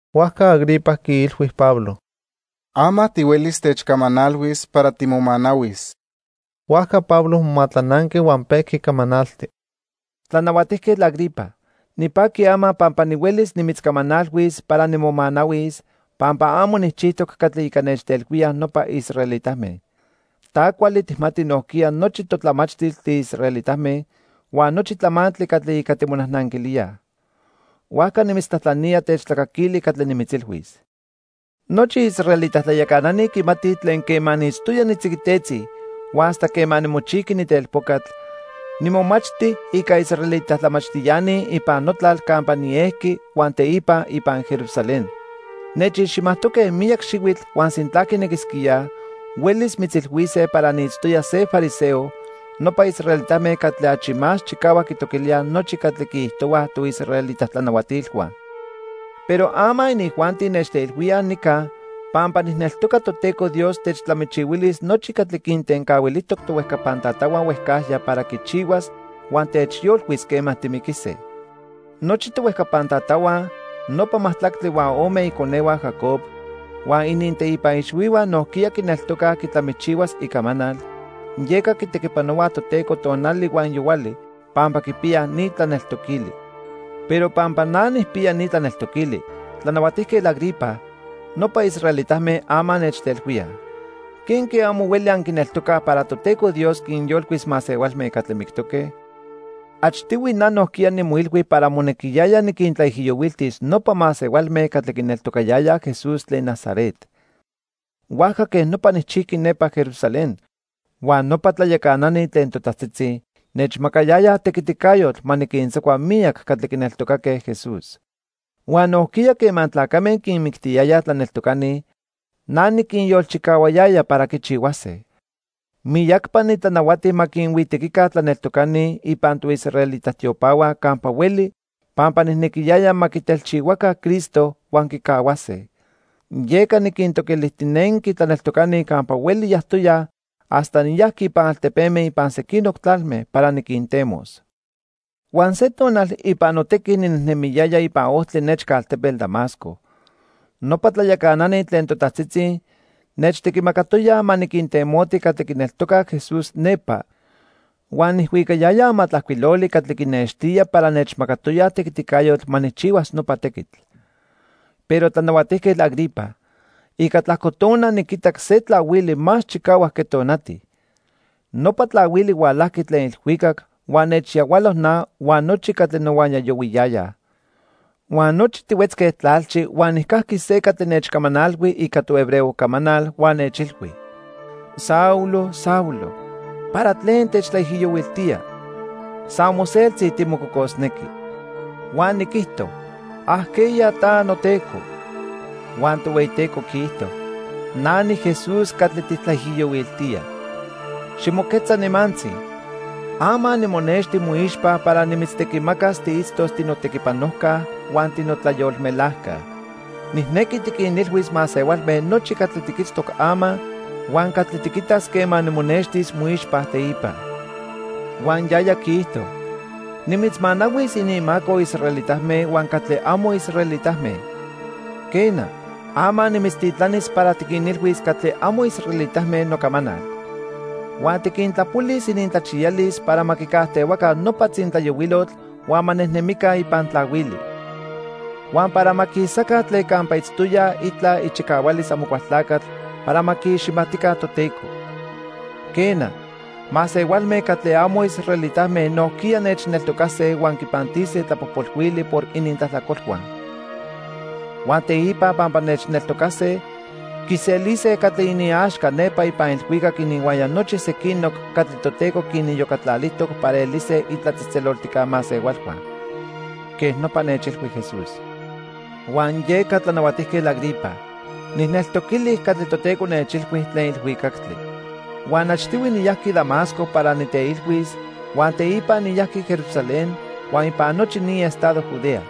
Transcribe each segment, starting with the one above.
Huajca Agripa quiilhui Pablo: —Ama tihuelis techcamanalhuis para timomanahuis. Huajca Pablo momatlananqui huan pejqui camanalti: "Tlanahuatijquetl Agripa, nipaqui ama pampa nihuelis nimitzcamanalhuis para nimomanahuis, pampa amo nijchijtoc catli ica nechtelhuíaj nopa israelitame. Ta cuali tijmati nojquiya nochi totlamachtil tiisraelitame huan nochi tlamantli catli ica timonajnanquilíaj. Huajca nimitztlajtlanía techtlacaquili catli nimitzilhuis." "Nochi israelita tlayacanani quimatij tlen quema niitztoya nitziquitetzi huan hasta quema nimochijqui nitelpocatl, nimomachti ica israelita tlamachtiani ipan notlal campa niejqui huan teipa ipan Jerusalén. Nechiximajtoque miyac xihuitl huan sintla quinequisquíaj, huelis mitzilhuise para niitztoya se fariseo, nopa israelitame catli achi más chicahuac quitoquilíaj nochi catli quiijtohuaj toisraelita tlanahuatilhua. Pero ama inijuanti nechtelhuíaj nica pampa nijneltoca Toteco Dios techtlamichihuilis nochi catli quintencahuilijtoc tohuejcapan tatahua huejcajya para quichihuas huan techyolcuis quema timiquise. Nochi tohuejcapan tatahua, nopa majtlactli huan ome iconehua Jacob, huan ininteipa ixhuihua nojquiya quineltocaj quitlamichihuas icamanal, yeca quitequipanohuaj Toteco tonali huan yohuali pampa quipiyaj ni tlaneltoquili. Pero pampa na nijpiya ni tlaneltoquili, Tlanahuatijquetl Agripa, nopa israelitame ama nechtelhuíaj. ¿Quenque amo hueli anquineltocaj para Toteco Dios quinyolcuis masehualme catli mictoque? "Achtihui na nojquiya nimoilhui para monequiyaya niquintlaijiyohuiltis nopa masehualme catli quineltocayayaj Jesús tlen Nazaret. Huajca quej nopa nijchijqui nepa Jerusalén. Huan nopa tlayacanani tlen totajtzitzi nechmacayayaj tequiticayotl ma niquintzacua miyac catli quineltocaque Jesús. Huan nojquiya quema tlacame quinmictiyayaj tlaneltocani, na niquinyolchicahuayaya para quichihuase. Miyacpa nitlanahuati ma quinhuitequica tlaneltocani ipan toisraelita tiopahua campa hueli pampa nijnequiyaya ma quitelchihuaca Cristo huan quicahuase. Yeca niquintoquilijtinenqui tlaneltocani campa hueli yajtoyaj hasta niyajqui ipan altepeme ipan sequinoc tlalme para niquintemos. "Huan se tonal ipan notequi ninejnemiyaya ipan ojtli nechca altepetl Damasco. Nopa tlayacanani tlen totajtzitzi nechtequimacatoyaj ma niquintemoti catli quineltocaj Jesús nepa huan nijhuicayaya amatlajcuiloli catli quinextía para nechmacatoyaj tequiticayotl ma nijchihuas nopa tequitl. Pero, Tlanahuatijquetl Agripa, ica tlajco tona niquitac se tlahuili más chicahuac que tonati. Nopa tlahuili hualajqui tlen ilhuicactli huan nechyahualo na huan nochi catli nohuaya yohuiyayaj. Huan nochi tihuetzque tlalchi huan nijcajqui se catli nechcamanalhui ica tohebreo camanal huan nechilhui: 'Saulo, Saulo, ¿para tlen techtlaijiyohuiltía? San moseltzi timococosnequi.' "Huan niquijto: '¿Ajqueya ta, noTeco?' "Huan Tohueyiteco quiijto: 'Na niJesús catli tijtlaijiyohuiltía. Ximoquetza nimantzi. Ama nimonexti moixpa para nimitztequimacas tiitztos tinotequipanojca huan tinotlayolmelajca. Nijnequi tiquinilhuis masehualme nochi catli tiquitztoc ama, huan catli tiquitas quema nimonextis moixpa teipa.' "Huan yaya quiijto: 'Nimitzmanahuis ininmaco israelitame huan catli amo israelitame. Quena, ama nimitztitlanis para tiquinilhuis catli amo israelitame nocamanal. Huan tiquintlapolis inintlachiyalis para ma quicajtehuaca nopa tzintlayohuilotl huan ma nejnemica ipan tlahuili. Huan para ma quisaca tlen campa itztoyaj itla ichicahualis Amocualtlacatl para ma quiiximatica Toteco. Quena, masehualme catli amo israelitame nojquiya nechneltocase huan quipantise tlapojpolhuili por inintlajtlacolhua. Huan teipa pampa nechneltocase, quiselise catli iniaxca nepa ipan ilhuicac ininhuaya nochi sequinoc catli Toteco quiniyocatlalijtoc para elise itlatzejtzeloltijca masehualhua.' Quej nopa nechilhui Jesús. "Huan yeca, Tlanahuatijquetl Agripa, nijneltoquili catli Toteco nechilhui tlen ilhuicactli. Huan achtihui niyajqui Damasco para niteilhuis huan teipa niyajqui Jerusalén huan ipan nochi ni estado Judea.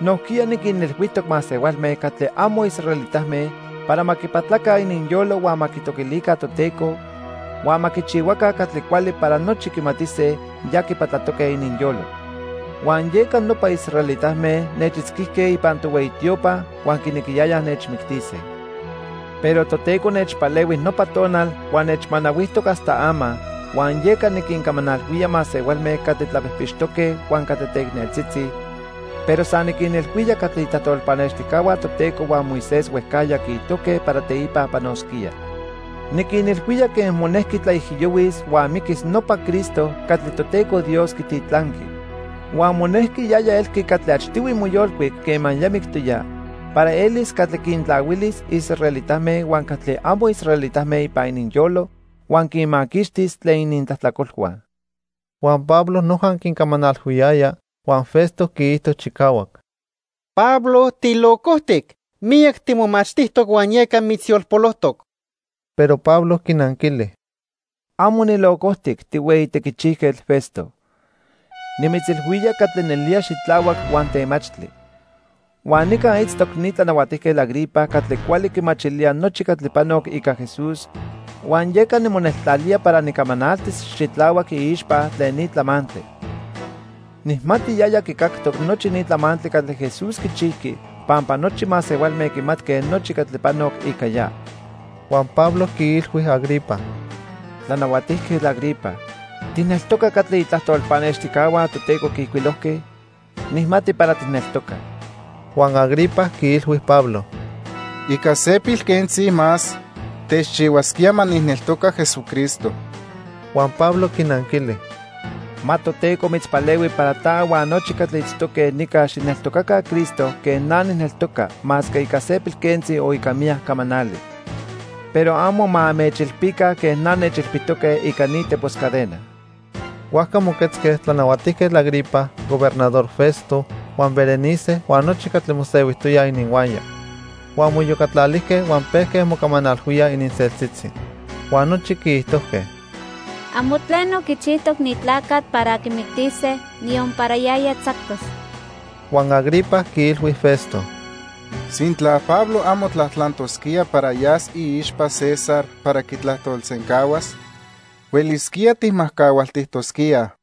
Nojquiya niquinilhuijtoc masehualme catli amo israelitame para ma quipatlaca ininyolo huan ma quitoquilica Toteco, huan ma quichihuaca catli cuali para nochi quimatise ya quipatlatoque ininyolo. Huan yeca nopa israelitame nechitzquijque ipan tohueyi tiopa huan quinequiyayaj nechmictise. Pero Toteco nechpalehui nopa tonal huan nechmanahuijtoc hasta ama, huan yeca niquincamanalhuía masehualme catli tlapijpixtoque huan catli teicneltzitzi, pero san niquinilhuía catli itlajtol pannextijcahua Toteco huan Moisés huejcajya quiijtojque para teipa panosquía. Niquinilhuía quen monejqui tlaijiyohuis huan miquis nopa Cristo catli Toteco Dios quititlanqui. Huan monejqui yaya elqui catli achtihui moyolcuic quema ya mictoya para elis catli quintlahuilis israelitame huan catli amo israelitame ipan ininyolo huan quinmaquixtis tlen inintlajtlacolhua." Huan Pablo noja quincamanalhuiyaya, huan Festo quiijto chicahuac: —¡Pablo tilocojtic! Miyac timomachtijtoc huan yeca mitzyolpolojtoc. Pero Pablo quinanquili: —Amo nilocojtic, tihueyi tequichijquetl Festo. Nimitzilhuía catli nelía xitlahuac huan temachtli. Huan nica itztoc ni Tlanahuatijquetl Agripa catli cuali quimachilía nochi catli panoc ica Jesús huan yeca nimoneltlalía para nicamanaltis xitlahuac iixpa tlen ni tlamantli. Nijmati yaya quicactoc nochi ni tlamantli catli Jesús quichijqui pampa nochi masehualme quimatque nochi catli panoc ica ya. Huan Pablo quiilhui Agripa: —Tlanahuatijquetl Agripa, ¿tijneltoca catli itlajtol pannextijcahua Toteco quiijcuilojque? Nijmati para tijneltoca. Huan Agripa quiilhui Pablo: —Ica se pilquentzi más techchihuasquía ma nijneltoca Jesucristo. Huan Pablo quinanquili: —Ma Toteco mitzpalehui para ta huan nochi catli itztoque nica xijneltocaca Cristo quen na nijneltoca masque ica se pilquentzi o ica miyac camanali. Pero amo ma anmechilpica quen na nechilpitoque ica ni tepos cadena. Huajca moquetzque Tlanahuatijquetl Agripa, Gobernador Festo, huan Berenice huan nochi catli mosehuijtoyaj ininhuaya. Huan moiyocatlalijque huan pejque mocamanalhuíaj ininseltzitzi. Huan nochi quiijtojque: —Amo tleno quichijtoc ni tlacatl para quimictise, niyon para yaya tzactos. Huan Agripa quiilhui Festo: —Sintla Pablo amo tlajtlantosquía para yas iixpa César para quitlajtolsencahuas, huelisquía tijmajcahualtijtosquíaj.